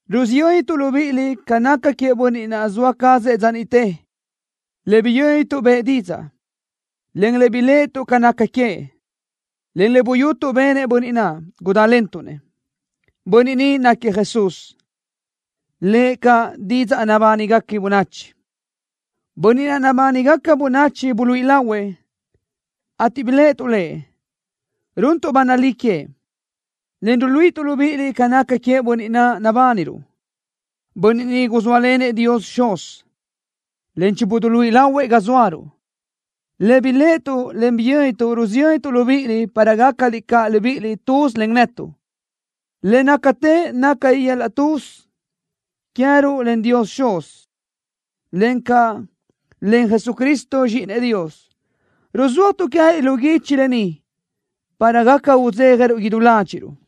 Rusiyöntuʼ libíʼiliʼ ca naca queëʼ Bönniʼ naʼ zoa cazëʼ dza niʼte, le biyö́nituʼ bëʼë didzaʼ, en le biléʼetuʼ ca naca queëʼ, en le buyutuʼ benëʼ Bönniʼ naʼ. Gudantuʼ Lëʼ. Bönniʼ ni náquiëʼ Jesús, lëʼ caʼ Didzaʼ Nabánigaca Bönachi. Bönniʼ naʼ nabánigaca bönachi buluíʼi lahuëʼ, ateʼ biléʼetuʼ Lëʼ. Runtuʼ ba nalí queëʼ, en ruluíʼituʼ libíʼiliʼ ca naca queëʼ Bönniʼ naʼ nabániruʼ. Bönniʼ ni guzóalenëʼ Dios Xuz, en chibuduluíʼi lahuëʼ ga zóaruʼ. Le biléʼetuʼ, en le biyö́nituʼ rusiyöntuʼ libíʼiliʼ para gácaliʼ caʼ libíʼiliʼ tuz len netuʼ. Le nácatë naca yöl-laʼ tuz queë́ruʼ len Dios Xuz, encaʼ len Jesucristo Zxíʼinëʼ Dios. Ruzúajtuʼ queë́liʼ lu guichi lë ni para gaca udzéjaruʼ idú ládxiʼruʼ.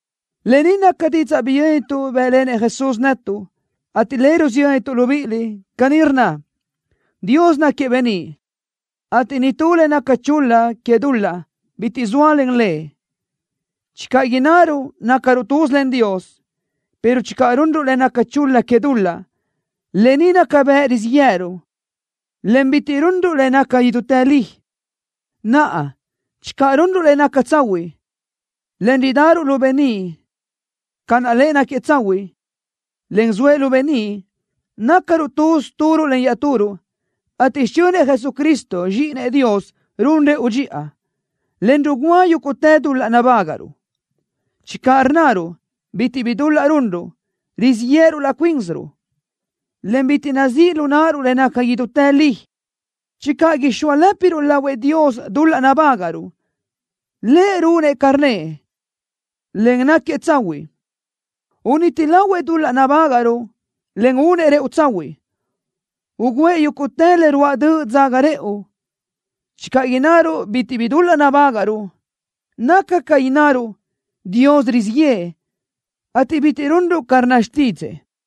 Lë ni naca didzaʼ biyö́nituʼ bë́ʼlenëʼ Jesús netuʼ, ateʼ le rusiyöntuʼ libíʼiliʼ. Caní rnna: Dios náquiëʼ beníʼ, ateʼ nitú le naca chul-la que dul-laʼ bitiʼ zóalen Lëʼ. Channö innaruʼ: “Nácaruʼ tuz len Dios”, pero channö runruʼ le naca chul-la que dul-laʼ, lë ni naca bëʼ rizíʼ yë́ʼëruʼ, en bitiʼ runruʼ le naca idútë li. Naʼa, channö runruʼ le naca tsahuiʼ, en ridaruʼ lu beníʼ ca naʼ Lëʼ náquiëʼ tsahuiʼ, en zoëʼ lu beníʼ, nácaruʼ tuz turuʼ len iaʼturuʼ, ateʼ xichönëʼ Jesucristo, Zxíʼinëʼ Dios ruún rëʼu dxiʼa, en rugúa yúguʼtë dul-laʼ nabágaʼruʼ. Channö rnnaruʼ: “Bitiʼ bi dul-laʼ runruʼ”, rizíʼ yéʼeruʼ laʼ cuínsiruʼ, en bitiʼ nazíʼ lu náʼaruʼ le naca idútë li. Channö ixóalëpiruʼ lahuëʼ Dios dul-laʼ nabágaʼruʼ, Lëʼ runëʼ ca rnnëʼ, en náquiëʼ tsahuiʼ. Uniti lahuëʼ dul-laʼ nabágaʼruʼ, en únëʼ rëʼu tsahuiʼ, ugǘëʼ yúguʼtë le ruáʼ döʼ dzaga rëʼu. Channö innaruʼ: “Bitiʼ bi dul-laʼ nabágaʼruʼ”, naca ca innaruʼ: “Dios rizíʼ yëʼë”, ateʼ bitiʼ runruʼ ca rnna xtídzëʼë.